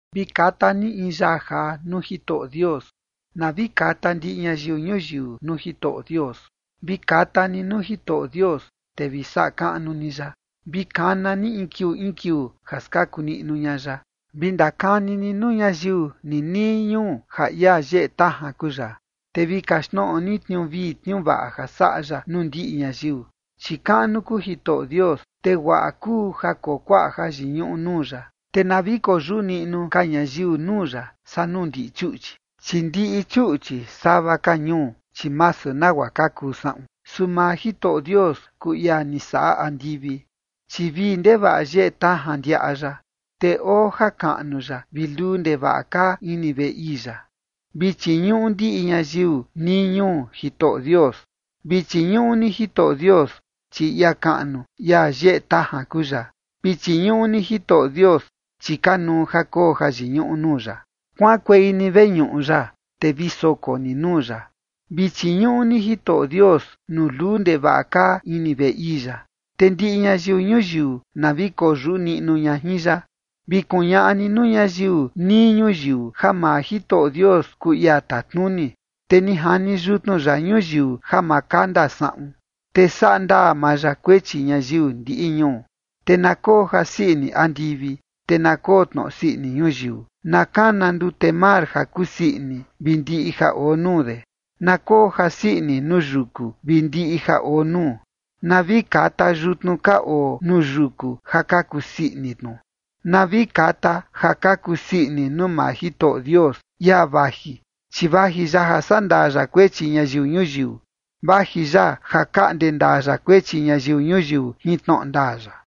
Vi kata ni in yaa jaa nuu Jitoꞌo Dios. Na vi kata ndiꞌi ñayiu ñuyiu nuu Jitoꞌo Dios. Vi kata ni nuu Jitoꞌo Dios, te vi saꞌa kaꞌnu ni ya. Vi kana ni in kiuu in kiuu ja skaku niꞌnu ña ya. Vi ndakani ni nuu ñayiu ninii ñuu ja ia yeꞌe tajan kuu ya, te vi kaxtnoꞌo ni tniuu vii tniuu vaꞌa ja saꞌa ya nuu ndiꞌi ñayiu. Chi kaꞌnu kuu Jitoꞌo Dios, te guaꞌa kuu ja koo kuaꞌa jayiñuꞌu nuu ya. Te na vi koyuꞌu niꞌnu ka ñayiu nuu ya saa nuu ndiꞌi chuꞌchi. Chi ndiꞌi chuꞌchi sava ka ñuu, chi masu nagua ka kuu saꞌun, su maa Jitoꞌo Dios kuu ia ni saꞌa andivi. Chi vii ndevaꞌa yeꞌe tajan ndiaꞌa ya, te oo jakaꞌnu ya vi luu ndevaꞌa kaa ini veꞌe ii ya. Vi chiñuꞌu ndiꞌi ñayiu nii ñuu Jitoꞌo Dios. Vi chiñuꞌu ni Jitoꞌo Dios, chi ia kaꞌnu ia yeꞌe tajan kuu ya. Vi chiñuꞌu ni Jitoꞌo Dios, chi kanuu ja koo jayiñuꞌu nuu ya. Kuaꞌankuei ni veñuꞌu ya, te vi soko ni nuu ya. Vi chiñuꞌu ni Jitoꞌo Dios nuu luu ndevaꞌa kaa ini veꞌe ii ya. Te ndiꞌi ñayiu ñuyiu na vi koyuꞌu niꞌnu ña jin ya. Vi kuñaꞌa ni nuu ñayiu nii ñuyiu ja maa Jitoꞌo Dios kuu ia tatnuni, te ni jani yutnu ya ñuyiu ja ma kanda saꞌun, te saꞌa ndaa maa ya kuechi ñayiu ndiꞌi ñuu. Te na koo jasii ini andivi, te na koo tnoꞌo sii ini ñuyiu. Na kana ndute mar ja kusii ini vi ndiꞌi ja oo nuu de. Na koo jasii ini nuu yuku vi ndiꞌi ja oo nuu. Na vi kata yutnu ka oo nuu yuku ja ka kusii ini tnu. Na vi kata ja ka kusii ini nuu maa Jitoꞌo Dios, ia vaji, chi vaji ya ja sandaa ya kuechi ñayiu ñuyiu. Vaji ya ja kaꞌnde ndaa ya kuechi ñayiu ñuyiu jin tnoꞌo ndaa ya.